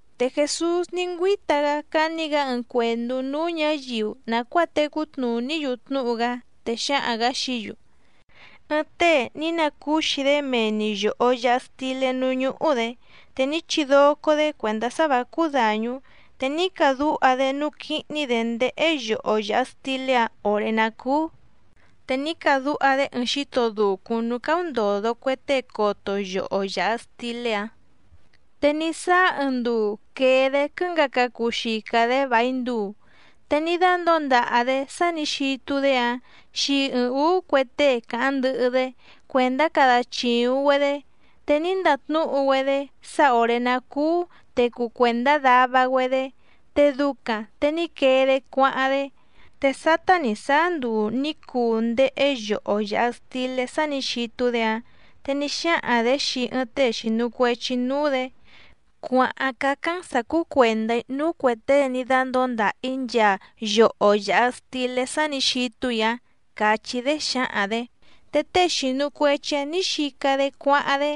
Te Jèsús ní ngüíta‑gá cání‑gǎ ɨɨⁿ cuèndú núú ñǎyiu nàcuáa tecú tnùní‑yu tnúhu‑gá, te xǎhaⁿ‑gǎ xií‑yu: —Ɨɨⁿ tée ní nacúxi‑dé mee‑ni yòho yaha stilé núú ñúhú‑dě, te ní chidoco‑dě cuèndá sá vǎ cúú dàñú, te ní cadúha‑dé núú quíhní‑dě ndéhé yoho yàha stilé‑áⁿ òré ná cùu, te ní cadúha‑dé ɨɨⁿ xíto dùcúⁿ núú cáúndòdo cue tée coto yoho yàha stilé‑áⁿ. ’Te ní sáá ɨɨⁿ nduu quèe‑dé quɨ́ngaca cuu xica‑dě vài nduu, te ní dándǒo ndaha‑dě sá nǐ xitu‑dé‑áⁿ xii ɨɨⁿ ǔú cue tée càháⁿ ndɨhɨ‑dé cuèndá cada chìuⁿ‑güedé, te ní ndatnúhu‑güedé sá òré ná cúú te cuu cuèndá dava‑güedé te ducaⁿ te ní quee‑dé cuáháⁿ‑dé. Te sátá nǐ sáá nduu nǐ cuu ndéhé yoho yàha stilé sá nǐ xitu‑dé‑áⁿ, te ní xáhaⁿ‑dě xii ɨɨⁿ tée xìnu cuechi núú‑dě: “Cuàháⁿ cácáⁿ‑n sǎ cúú cuèndá‑í núú cuè tée ní dándǒo ndàha‑í nchaa yoho yàha stilé sá nǐ xitu‑í‑áⁿ”, càchí‑dé xǎhaⁿ‑dě. Te tée xìnu cuechi‑áⁿ nǐ xica‑dé cuáháⁿ‑dé.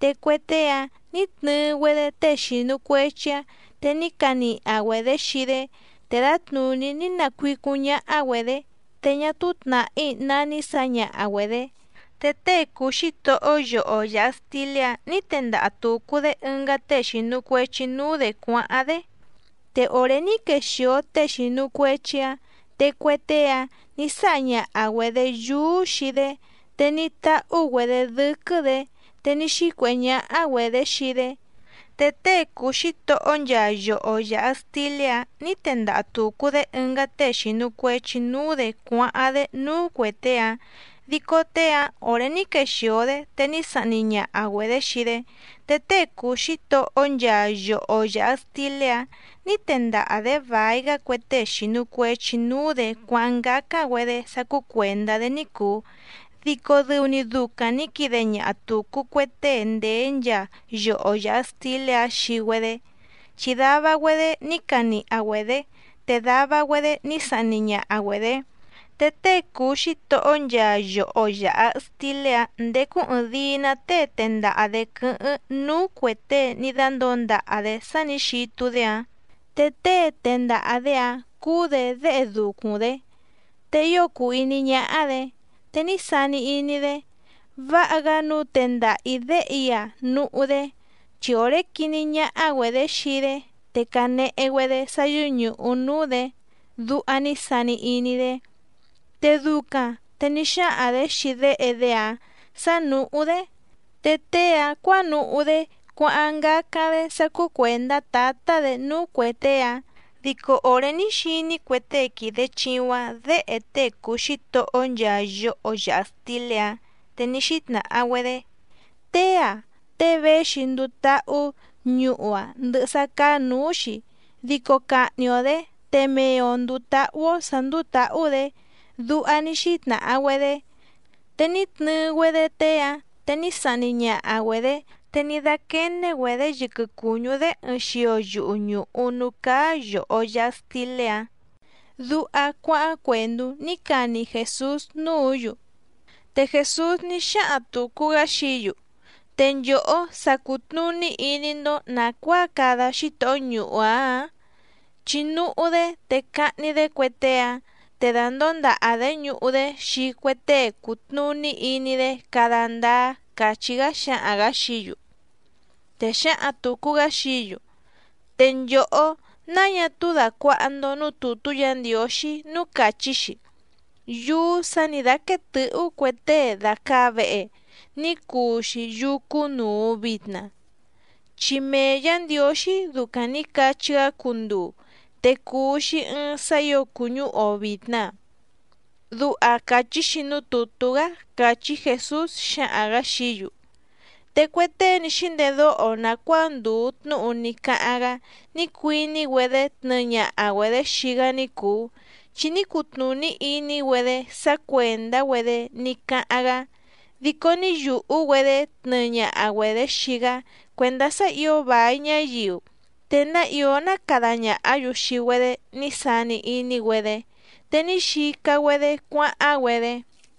Te cue tée‑áⁿ nǐ tnɨɨ‑güedé tée xìnu cuechi‑áⁿ, te ní caniha‑güedě xii‑dé, te dǎtnùní ní nacuícúⁿ ñáhá‑güedě, te ñá túú tnàhí ná ní sǎñaha‑güedě. Te tée cùu xítohó yoho yàha stilé‑áⁿ nǐ tendaha tùcu‑dé ɨngá tée xìnu cuechi núú‑dě cuáháⁿ‑dé. Te òré ní quexìo tée xìnu cuechi‑áⁿ te cue tée‑áⁿ nǐ sáha ñaha‑güedě yúú xii‑dé, te ní táhú‑güedě dɨ́quɨ́‑dě, te ní xícuèhé ñáhá‑güedě xii‑dé. Te tée cùu xítohó nchaa yoho yàha stilé‑áⁿ nǐ tendaha tùcu‑dé ɨngá tée xìnu cuechi núú‑dě cuáháⁿ‑dé núú cuè tée‑áⁿ, dico tée‑áⁿ òré ní quexìo‑dé te ní sahni ñaha‑güedě xii‑dé. Te tée cùu xítohó nchaa yoho yàha stilé‑áⁿ nǐ tendaha‑dě vài‑gá cue tée xìnu cuechi núú‑dě cuáháⁿ ngácáⁿ‑güedé sá cúú cuèndá‑dé ní cùu dico dɨu‑ni ducaⁿ nǐ quide ñaha tùcu cue tée ndèé nchaa yoho yàha stilé‑áⁿ xii‑güedé, chi dava‑güedé ní caniha‑güedě te dava‑güedé ní sahni ñaha‑güedě. ’Te tée cùu xítohó nchaa yoho yàha stilé‑áⁿ ndécú ɨ̀ɨⁿdii‑ná tée tendaha‑dě quɨ́hɨ́ⁿ núú cuè tée ní dándǒo ndaha‑dě sá nǐ xitu‑dé‑áⁿ, te tée tendaha‑dě‑áⁿ cúú‑dě déhe ducuⁿ‑dé, te ío cùu iní ñáhá‑dě. Te ní sani iní‑dé: “Váha‑gá nǔu tendaha‑ǐ déhe‑í‑a núhú‑dé, chi òré quiní ñáhá‑güedě xii‑dé te cànehe‑güedé sá yɨ́ñùhu núú‑dě”, duha ní sani iní‑dé. Te ducaⁿ te ní xáhaⁿ‑dě xii déhe‑dé‑áⁿ sǎ nùhú‑dé, te tée‑áⁿ cuǎnuhú‑dé cuáháⁿ ngácáⁿ‑dé sá cúú cuèndá tǎtá‑dě núú cuè tée‑áⁿ. Dico òré ní xiní cue tée quìde chiuⁿ‑áⁿ děhe tée cùu xítohó nchaa yoho yàha stilé‑áⁿ, te ní xítnàha‑güedé: “Tée‑ǎⁿ tée véxi nduu táhú ñuhu‑a ndɨhɨ sá cáá nǔú‑xi, dico cahni‑o‑dě te mee‑o ndùu táhú‑ó sǎ ndúú tǎhú‑dě”, duha ní xítnàha‑güedé. Te ní tnɨɨ‑güedé tée‑áⁿ, te ní sahni ñaha‑güedě, te ní dáquéné‑güedě yɨquɨ cùñú‑dé ɨɨⁿ xio yuhu ñùhu núú cáá yòho yaha stilé‑áⁿ —duha cuáháⁿ cuèndú ní cani Jèsús núǔ‑yu. Te Jèsús ní xáhaⁿ tùcu‑gá xií‑yu: —¿Te nchòhó sa cùtnuní iní‑ndó nàcuáa cada xítohó ñuhu‑áⁿ ǎⁿ? Chi núhú‑dé te cahni‑dé cue tée‑áⁿ te dàndóo ndaha‑dě ñuhu‑dé xii cue tée cùtnuní iní‑dé cada ndáá —càchí‑gá xǎhaⁿ‑gǎ xií‑yu. Te xǎhaⁿ tùcu‑gá xií‑yu: —Te nchòhó, náa ñá túú dàcuaha‑ndo núú tùtú Yǎ Ndiǒxí núú càchí‑xi: Yúú sǎ nǐ dáquéé tɨ̌hú cue tée dàcaa vehe, ní cuu‑xi yúú cúnùu vitna. Chi mee Yǎ Ndiǒxí ducaⁿ nǐ cachí‑gá cunduu, te cùu‑xi ɨɨⁿ sá ǐo cùñúhu‑o vìtna. Duha càchí‑xi núú tùtú‑gá —càchí Jèsús xǎhaⁿ‑gǎ xií‑yu. Te cue tée ní xíndedóho nàcuáa ndùu tnúhu ní cáháⁿ‑gá ní cuiní‑güedé tnɨɨ ñaha‑güedě xii‑gá ní cùu, chi ní cutnùní iní‑güedé sá cuèndá‑güedé ní cáháⁿ‑gá, dico ní yùhú‑güedé tnɨɨ ñaha‑güedě xii‑gá cuèndá sá ǐo vài ñáyiu, te ná ìó ná cada ñàhá‑yu xii‑güedé ní sani iní‑güedé, te ní xica‑güedé cuáháⁿ‑güedé.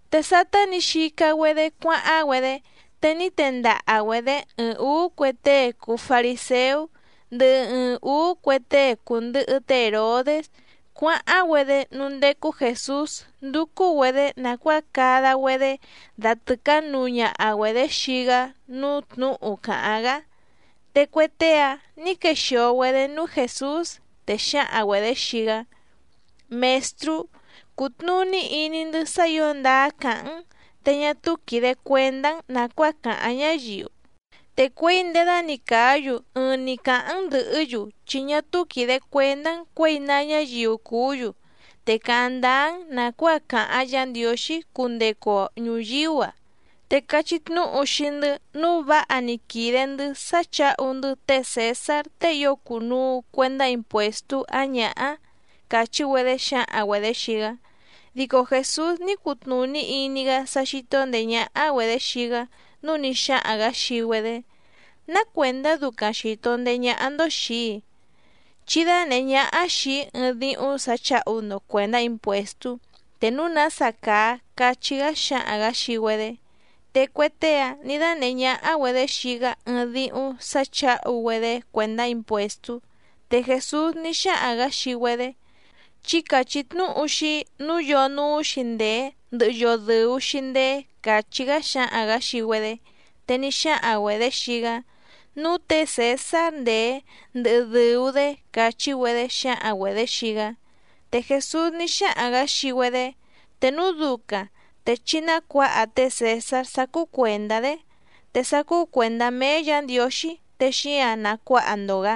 Te sátá nǐ xica‑güedé cuáháⁿ‑güedé, te ní tendaha‑güedě ɨɨⁿ ǔú cue tée cùu fariséú, ndɨhɨ ɨɨⁿ ǔú cue tée cùndɨhɨ té Hèrodés cuáháⁿ‑güedé núú ndécú Jèsús ndúcú‑güedě nàcuáa cada‑güedé datɨ̀cánuu ñaha‑güedě xii‑gá núú tnǔhu càháⁿ‑gá. Te cue tée‑áⁿ nǐ quexìo‑güedé núú Jèsús, te xǎhaⁿ‑güedě xii‑gá: —Mèstrú, cùtnuní iní‑ndɨ́ sá ǐo ndáá càháⁿ‑n, te ñá túú quìde cuendá‑n nàcuáa càháⁿ ñáyiu, te cuěi ndědani càá‑yu ɨɨⁿ‑ni càháⁿ‑n ndɨ̀hɨ́‑yu chi ñá túú quìde cuendá‑n cuěi ná ñáyiu cùú‑yu, te càháⁿ ndáá‑n nàcuáa càháⁿ Yǎ Ndiǒxí cundecu‑o ñùyíú‑a. Te cachí tnúhu xii‑ndɨ́ nǔu váha‑ni quìde‑ndɨ́ sá chǎhu‑ndɨ́ té Cèsár tée ío cùnuu cuendá impuèstú ǎⁿ ñǎhá —càchí‑güedé xǎhaⁿ‑güedě xii‑gá. Dico Jèsús ní cutnùní iní‑gá sá xító ndèé ñáhá‑güedě xii‑gá, núu ní xáhaⁿ‑gǎ xii‑güedé: —¿Ná cuèndá ducaⁿ xìto ndeé ñáhá‑ndó xìi‑í? Chí dánèhé ñáhá xìi‑í ɨɨⁿ díhúⁿ sǎ chǎhu‑ndo cuèndá impuèstú te núu nása càa —cachí‑gá xǎhaⁿ‑gǎ xii‑güedé. Te cue tée‑áⁿ nǐ dánèhé ñáhá‑güedě xii‑gá ɨɨⁿ díhúⁿ sǎ chǎhu‑güedé cuèndá impuèstú. Te Jèsús ní xáhaⁿ‑gǎ xii‑güedé: —Chí càchí tnúhu xii‑í nǔu yoo núú‑xi ndèé ndɨhɨ yoo dɨ̀u‑xi ndeé —càchí‑gá xǎhaⁿ‑gǎ xii‑güedé. Te ní xáhaⁿ‑güedě xii‑gá: —Núú tě Cèsár ndèé ndɨhɨ dɨ̀u‑dé —càchí‑güedé xǎhaⁿ‑güedě xii‑gá. Te Jèsús ní xáhaⁿ‑gǎ xii‑güedé: —Te núu ducaⁿ te chí nácuǎha té Cèsár sá cúú cuèndá‑dé, te sá cúú cuèndá méé Yǎ Ndiǒxí te xíǎⁿ nacuáha‑ndo‑gǎ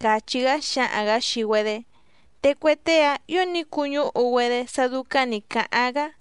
—càchí‑gá xǎhaⁿ‑gǎ xii‑güedé. Te cue tée‑áⁿ ǐo ní cuñúhu‑güedé sá dúcáⁿ nǐ cáháⁿ‑gá.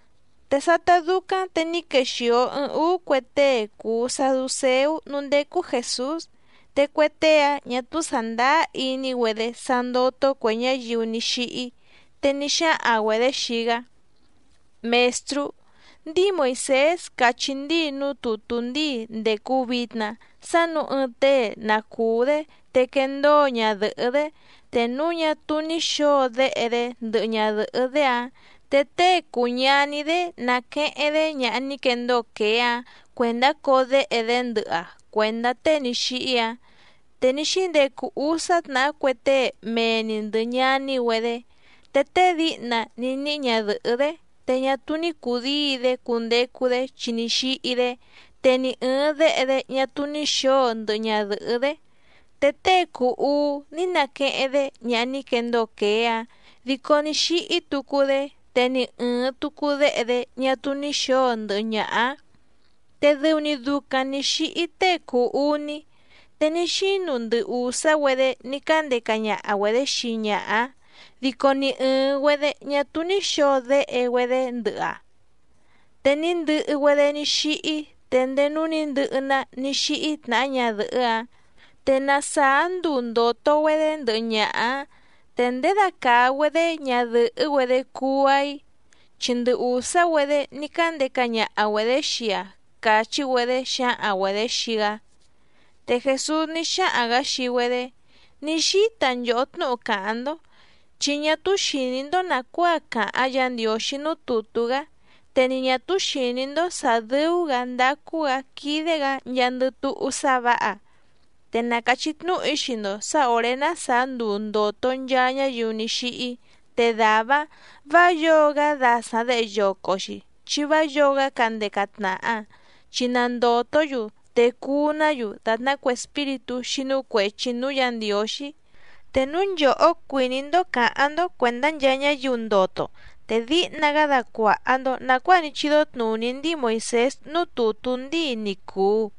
Te sátá dúcáⁿ te ní quexìo ɨɨⁿ úú cue tée cùu saducéú núú ndécú Jèsús, te cue tée‑áⁿ ñǎ túú sàndáá iní‑güedé sá ndótó cuè ñáyiu ní xíhí, te ní xáhaⁿ‑güedě xii‑gá: —Mèstrú, ndíi Moìsés càchí ndíi núú tùtú ndíi ndècu vitna sá nǔu ɨɨⁿ tée na cùú‑dé te quendóo ñadɨ̀hɨ́‑dé, te núu ñá túú ní xǒo déhe‑dé ndɨhɨ ñadɨ̀hɨ́‑dé‑áⁿ, te tée cùu ñaní‑dé naqueheⁿ‑dé ñaha ní quendóo quèé‑áⁿ cuèndá coo déhe‑dé ndɨhɨ‑aⁿ cuèndá tée ní xíhí‑áⁿ. Te ní xíndecu úsá tnàhá cue tée mee‑ni ndɨ̀ ñaní‑güedé. Te tée díhna ní níhí ñadɨ̀hɨ́‑dé, te ñá túú ní cùdíi‑dé cundecu‑dé chi ní xíhí‑dé, te ni ɨ̀ɨⁿ déhe‑dé ñá túú ní xǒo ndɨhɨ ñadɨ̀hɨ́‑dé. Te tée cùu uú ní naqueheⁿ‑dé ñaha ní quendóo quèé‑áⁿ, dico ní xíhí tucu‑dé, te ni ɨ̀ɨⁿ tucu déhe‑dé ñá túú ní xǒo ndɨhɨ ñaha‑áⁿ. Te dɨu‑ni ducaⁿ nǐ xíhí tée cùu uní. Te ní xínu ndɨ ùsá‑güedé ní cándeca ñaha‑güedě xii ñaha‑áⁿ, dico ni ɨ̀ɨⁿ‑güedé ñá túú ní xǒo déhe‑güedé ndɨhɨ‑aⁿ, te ní ndɨhɨ‑güedé ní xíhí te ndéé núú nǐ ndɨhɨ‑ná ní xíhí tnàhá ñadɨ̀hɨ́‑áⁿ. Te na sàá nduu ndòto‑güedé ndɨhɨ ñaha‑ǎⁿ, ¿te ndědacàa‑güedé ñadɨ̀hɨ́‑güedé cuu‑aⁿ‑i? Chi ndɨ ùsá‑güedé ní cándeca ñaha‑güedě xii‑aⁿ —càchí‑güedé xǎhaⁿ‑güedě xii‑gá. Te Jèsús ní xáhaⁿ‑gǎ xii‑güedé: —Ní xíta nchòhó tnúhu càháⁿ‑ndó, chi ñá túú xìní‑ndó nàcuáa càháⁿ Yǎ Ndiǒxí núú tùtú‑gá, te ni ñà túú xìní‑ndó sǎ dɨ́ú‑gǎ ndácú‑gǎ quídé‑gǎ nchaandɨ túhú sá vǎha. Te na càchí tnúhu‑í xii‑ndo sǎ òré ná sàá nduu ndòto nchaa ñáyiu ní xíhí, te dàvá‑áⁿ vǎ yǒo‑gá dasaⁿ děhe yoco‑xi chi vá yǒo‑gá candeca tnàha, chi na ndòtó‑yu te cuu‑ná‑yu dàtná cue espíritú xínú cuèchi núú Yǎ Ndiǒxí. Te núu nchòhó cuìní‑ndó cǎháⁿ‑ndó cuèndá nchaa ñáyiu ndoto, te díhna‑gá dacuàha‑ndo nacuáa ní chídó tnùní ndíi Moìsés núú tùtú ndíi ni cùu.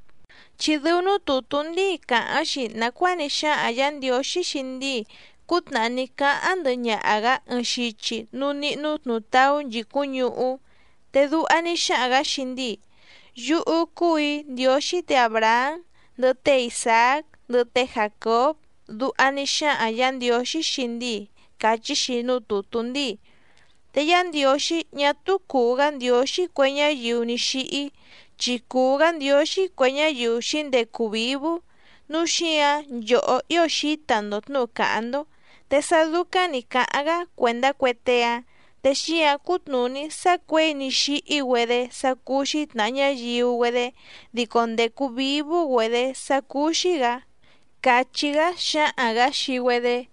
Chi dɨu núú tùtú ndíi càháⁿ‑xi nàcuáa ní xáhaⁿ Yǎ Ndiǒxí xii ndíi cútnàhá ní cáháⁿ ndɨhɨ ñaha‑gǎ ɨɨⁿ xichi núú níhnú tnùtaú nchìcúⁿ ñuhú. Te duha ní xáhaⁿ‑gǎ xii ndíi: “Yúhú cúù‑í Ndiǒxí tě Àbrahám, ndɨhɨ té Isàác, ndɨhɨ té Jàcób”, duha ní xáhaⁿ Yǎ Ndiǒxí xii ndíi càchí‑xi núú tùtú ndíi. Te Yá Ndiǒxí ñá túú cùu‑gá Ndiǒxí cue ñáyiu ní xíhí, chi cùu‑gá Ndiǒxí cue ñáyiu xǐndecu vǐvú, núu xíǎⁿ nchòhó ío xǐta‑ndo tnǔhu càháⁿ‑ndó. Te sá dúcáⁿ nǐ cáháⁿ‑gá cuèndá cue tée‑áⁿ, te xíǎⁿ cútnùní sá cuěi ní xíhí‑güedé sá cúú‑xí tnàha ñáyiu‑güedé, dico ndècu vívú‑güedě sá cúú‑xí‑gǎ —càchí‑gá xǎhaⁿ‑gǎ xii‑güedé.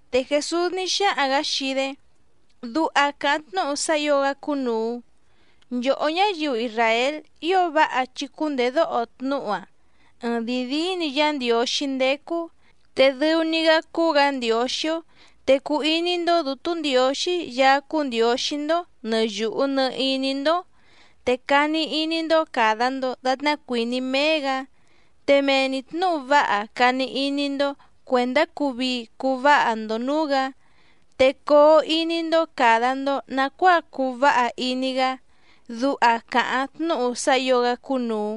Te Jèsús ní xáhaⁿ‑gǎ xii‑dé: —Duha càháⁿ tnúhu sá ǐo‑gá cúnùu: “Nchòhó ñáyiu isràél ío váha chí cúndèdóho tnúhu‑a. Ɨɨⁿdìi díí‑ni Yá Ndiǒxí ndécú, te dɨu‑ni‑gá cúú‑gǎ Ndiǒxí‑ó. Te cuu iní‑ndó Dǔtú Ndiǒxí Yaá cúú Ndiǒxí‑ndó nɨ̀ yuhu nɨ iní‑ndó, te cani iní‑ndó càda‑ndo datná cuìní méé‑gǎ, te mee‑ni tnǔhu váha cani iní‑ndó cuèndá cuu vii cuu váha‑ndo nǔú‑gǎ, te coo iní‑ndó càda‑ndo nacuáa cuu váha iní‑gá”, duha càháⁿ tnúhu sá ǐo‑gá cúnùu.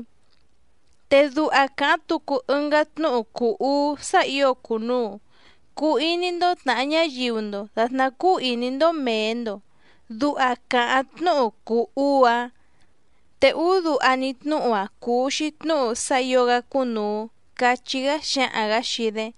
Te duha càháⁿ tucu ɨngá tnúhu cùu uú sá ǐo cùnuu: “Cuu iní‑ndó tnàha ñáyiu‑ndo dàtná cúú ìní‑ndó mèe‑ndo”, duha càháⁿ tnúhu cùu uú‑áⁿ. Te úú duha‑ni tnúhu‑a cùu‑xi tnúhu sá ǐo‑gá cúnùu —cachí‑gá xǎhaⁿ‑gǎ xii‑dé.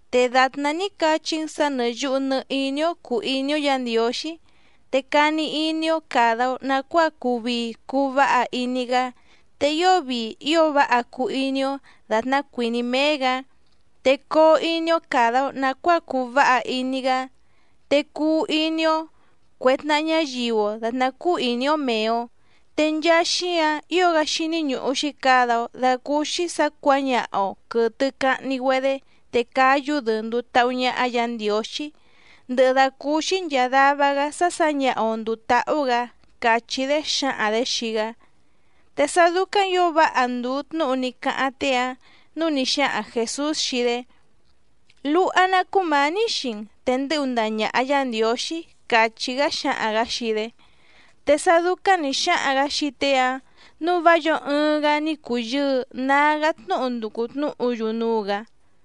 Te dàtná ní cachí‑n sǎ nɨ̀ yuhu nɨ iní‑ó cùu iní‑ó Yǎ Ndiǒxí, te cani iní‑ó càda‑o nacuáa cuu vii cuu váha iní‑gá te ío vii ío váha cuu iní‑ó dàtná cuìní méé‑gǎ, te coo iní‑ó càda‑o nacuáa cuu váha iní‑gá, te cuu iní‑ó cuè tnaha ñáyiu‑o dàtná cúú ìní‑ó mèe‑o. Te nchaa xíǎⁿ ío‑gá xíní ñùhu‑xi cada‑o dacúúxí sǎ cuǎñaha‑o quɨ̀tɨ cahni‑güedé te cáyú‑dɨ nduu táhú ñáhá Yǎ Ndiǒxí, ndɨhɨ dàcúúxí nchàa dava‑gá sá sǎñaha‑o ndùu táhú‑gǎ —càchí‑dé xǎhaⁿ‑dě xii‑gá. Te sá dúcáⁿ ǐo váha ndùu tnúhu ní cáháⁿ tée‑áⁿ, núu ní xáhaⁿ Jèsús xii‑dé: —Luha‑ná cúmǎní xii‑n te ndɨ́hu ndaha ñàha Yá Ndiǒxí —càchí‑gá xǎhaⁿ‑gǎ xii‑dé. Te sá dúcáⁿ nǐ xáhaⁿ‑gǎ xii tée‑áⁿ, núu vá yǒo ɨɨⁿ‑gá ní cùyɨɨ nágá tnúhu nducu tnǔhu‑yu núú‑gǎ.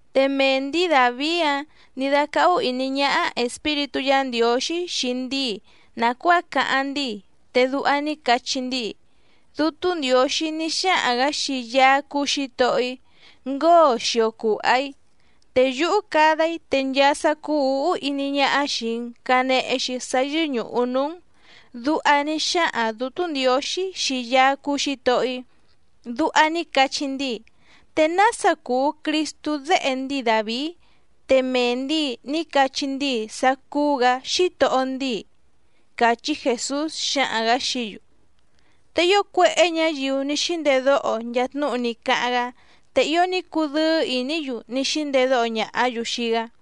Te mee ndǐi Dàvií‑áⁿ nǐ dácáhú ìní ñáhá Espíritú Yǎ Ndiǒxí xii ndíi nàcuáa cáháⁿ ndíi, te duha ní cachí ndíi: Dútú Ndiǒxí ní xáhaⁿ‑gǎ xii Yaá cúú Xǐtohó‑í: “Ngóo xio cùha‑í, te yúhú cada‑í te nchaa sá cúú ǔhú iní ñáhá xìi‑n canehe‑xi sá yɨ́ñùhu núú‑n.” Duha ní xáhaⁿ Dǔtú Ndiǒxí xii Yaá cúú Xǐtohó‑í. Duha ní cachí ndíi. ¿Te nása cùu Cristú déhe ndíi Dàvií, te mee ndǐi ní cachí ndíi sá cúú‑gǎ Xítohó ndíi? —càchí Jèsús xǎhaⁿ‑gǎ xií‑yu. Te ío cuéhé ñǎyiu ní xíndedóho nchaa tnúhu ní cáháⁿ‑gá, te ío ní cudɨ́ɨ́ ìní‑yu ní xíndedóho ñàhá‑yu xii‑gá.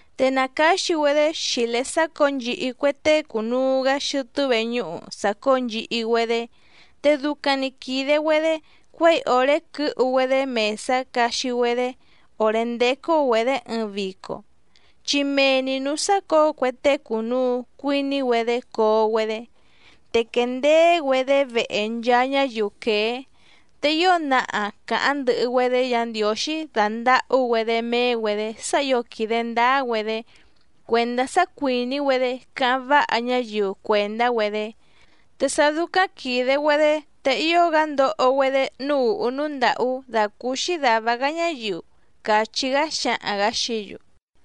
Te nàcáxi‑güedé xìlé sácǒo nchihi cue tée cùnuu‑gá xɨtɨ́ veñúhu sàcóo nchihi‑güedé. Te ducaⁿ‑ni quìde‑güedé cuěi òré quɨ́hu‑güedé mèsá caxi‑güedé òré ndécú‑güedě ɨɨⁿ vico, chi mee‑ni nǔú sácǒo cue tée cùnuu cuiní‑güedé coo‑güedé. Te quèndeé‑güedé vehe nchaa ñáyiu quèé, te ío naha càháⁿ ndɨhɨ‑güedé Yǎ Ndiǒxí dàndahú‑güedé méé‑güedě sá ǐo quìde ndáá‑güedé cuèndá sá cuìní‑güedé cáháⁿ váha ñáyiu cuèndá‑güedé. Te sá dúcáⁿ quìde‑güedé te ío‑gá ndoho‑güedé núú ùhú núú ndàhú dàcúúxí dàva‑gá ñáyiu —càchí‑gá xǎhaⁿ‑gǎ xií‑yu.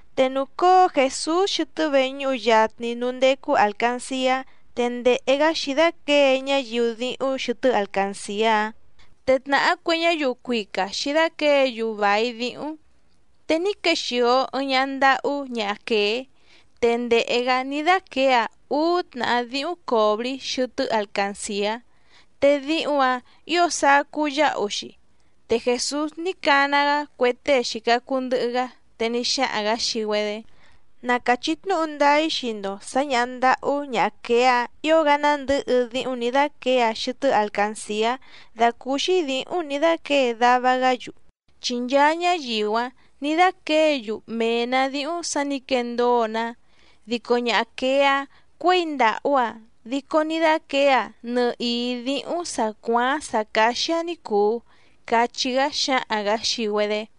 Te nùcóo Jèsús xɨtɨ́ veñúhu yatni núú ndécú àlcanciá te ndèhe‑gá xǐdáquěe ñáyiu díhúⁿ xɨtɨ́ alcancìá‑áⁿ, te tnàhá cue ñáyiu cuica xǐdáquěe‑yu vài díhúⁿ. Te ní quexìo ɨɨⁿ ñaha ndahú ñaha quèé, te ndèhe‑gá ní dáquěe‑aⁿ úú tnàhá díhúⁿ còbrí xɨtɨ́ alcancìá, te díhúⁿ‑ǎⁿ ǐo sacú yáhu‑xi. Te Jèsús ní cana‑gá cue tée xìca cuu ndɨhɨ‑gá, te ní xáhaⁿ‑gǎ xii‑güedé: —Na càchí tnúhu ndáá‑í xii‑ndo sǎ ñàha ndahú ñaha quèé‑a ío‑gá nándɨ̌hɨ díhúⁿ nǐ dáquěe‑aⁿ xɨtɨ́ alcancìá dàcúúxí dǐhúⁿ nǐ dáquěe dava‑gá‑yu. Chi nchaa ñáyiu‑áⁿ nǐ dáquěe‑yu mee‑nǎ díhúⁿ sǎ nǐ quendóo‑ná, dico ñaha quèé‑a cuěi ndàhú‑aⁿ dico ní dáquěe‑aⁿ nɨhìí díhúⁿ sǎ cuááⁿ sǎ cáxí‑áⁿ ní cùu —cachí‑gá xǎhaⁿ‑gǎ xii‑güedé.